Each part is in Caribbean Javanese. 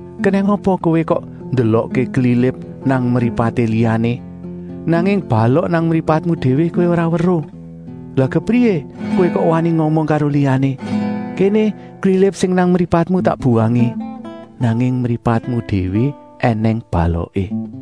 Kenèng apa kowé kok ndelokké klilip nang mripaté liyané, nanging balok nang mripatmu déwé kowé ora weruh. Lah kepriyé kowé kok wani ngomong karo liyané: ‘Kéné klilip sing nang mripatmu tak buwangé,’ nanging mripatmu déwé ènèng baloké.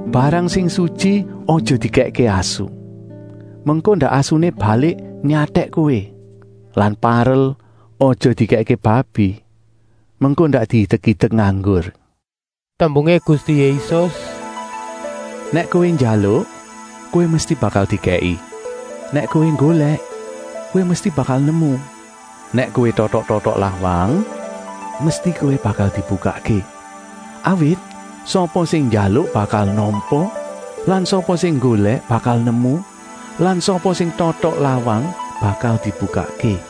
“Barang sing sutyi aja dikèkké asu, mengko ndak asuné balik nyatèk kowé. Lan parel aja dikèkké babi, mengko ndak diidek-idek nganggur.” Tembungé Gusti Yésus: “Nèk kowé njaluk, kowé mesti bakal dikèki; nèk kowé nggolèk, kowé mesti bakal nemu; nèk kowé totok-totok lawang, mesti kowé bakal dibukakké. Awit sapa sing njaluk bakal nampa lan sapa sing nggolèk bakal nemu lan sapa sing totok lawang bakal dibukakké.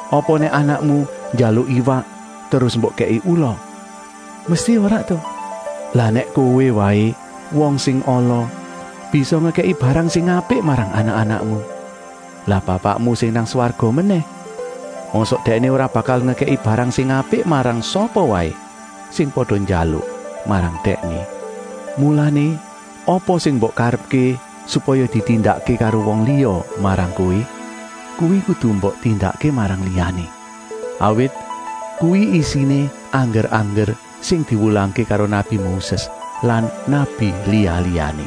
Apa nèk anakmu njaluk iwak terus mbok kèki ula? Mesti ora ta! Lah nèk kowé waé, wong sing ala, bisa ngekèki barang sing apik marang anak-anakmu, lah Bapakmu sing nang swarga menèh? Mosok Dèkné ora bakal ngekèki barang sing apik marang sapa waé sing pada njaluk marang Dèkné. “Mulané apa sing mbok karepké supaya ditindakké karo wong liya marang kowé, kuwi kudu mbok tindakké marang liyané. Awit kuwi isiné angger-angger sing diwulangké karo nabi Moses lan nabi liya-liyané.”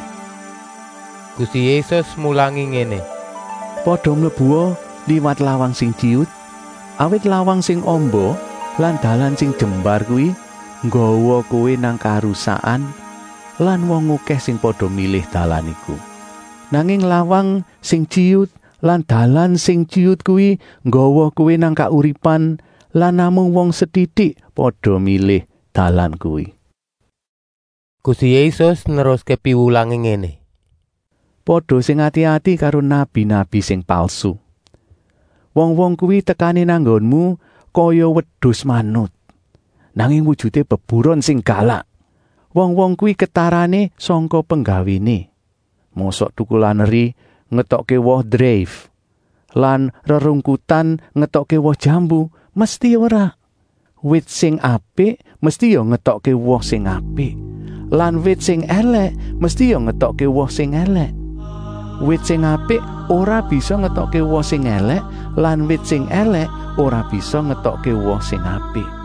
Gusti Yésus mulangi ngéné: “Pada mlebua liwat lawang sing tyiyut, awit lawang sing amba lan dalan sing jembar kuwi nggawa kowé nang karusakan lan wong okèh sing pada milih dalan iku. Nanging lawang sing tyiyut lan dalan sing tyiyut kuwi nggawa kowé nang kauripan lan namung wong setitik pada milih dalan kuwi.” Gusti Yésus neruské piwulangé ngéné: “Pada sing ati-ati karo nabi-nabi sing palsu. Wong-wong kuwi tekané nang nggonmu kaya wedus manut, nanging wujuté beburon sing galak. Wong-wong kuwi ketarané sangka penggawéné. Mosok tukulan eri ngetokké woh dreif lan rerungkutan ngetokké woh jambu? Mesti ora ta! Wit sing apik mesti ya ngetokké woh sing apik lan wit sing èlèk mesti ya ngetokké woh sing èlèk. Wit sing apik ora bisa ngetokké woh sing èlèk lan wit sing èlèk ora bisa ngetokké woh sing apik.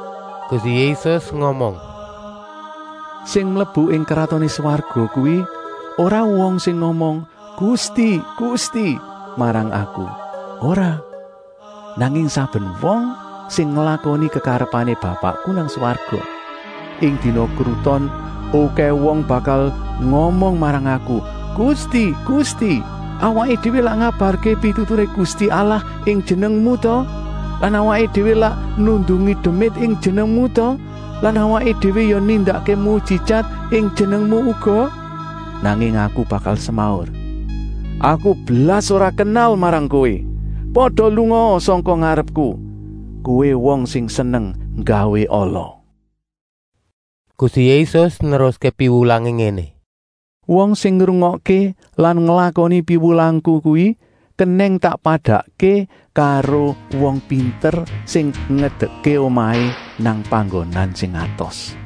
Gusti Yésus ngomong: “Sing mlebu ing Kratoné Swarga kuwi ora wong sing ngomong ‘Gusti, Gusti’ marang Aku, ora, nanging saben wong sing nglakoni kekarepané Bapakku nang swarga. Ing dina kruton okèh wong bakal ngomong marang Aku: ‘Gusti, Gusti, awaké déwé lak ngabarké pituturé Gusti Allah ing jenengmu ta? Lan awaké déwé lak nundungi demit ing jenengmu ta lan awaké déwé ya nindakké mujijat ing jenengmu uga?’ Nanging Aku bakal semaur: ‘Aku blas ora kenal marang kowé. Pada lungaa sangka ngarepku, kowé wong sing seneng nggawé ala!’” Gusti Yésus neruské piwulangé ngéné: “Wong sing ngrungokké lan nglakoni piwulangku kuwi kenèng tak padakké karo wong pinter sing ngedekké omahé nang panggonan sing atos.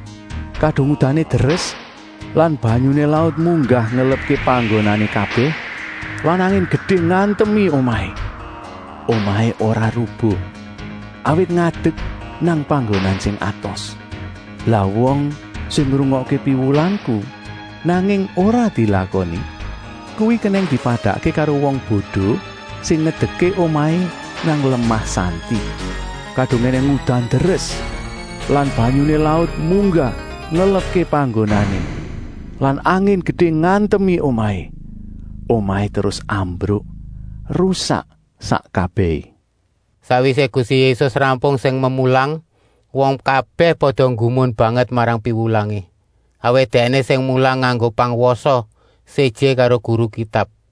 Kadung udané deres lan banyuné laut munggah ngelepké panggonané kabèh lan angin gedé ngantemi omahé, omahé ora rubuh, awit ngadek nang panggonan sing atos. “Lah wong sing ngrungokké piwulangku, nanging ora dilakoni, kuwi kenèng dipadakké karo wong bodo sing ngedekké omahé nang lemah santi. Kadung ènèng udan deres lan banyuné laut munggah ngelepké panggonané lan angin gedé ngantemi omahé, omahé terus ambruk, rusak sak kabèhé.” Sakwisé Gusti Yésus rampung sing memulang, wong kabèh pada nggumun banget marang piwulangé. Awit Dèkné sing mulang nganggo pangwasa, séjé karo guru Kitab.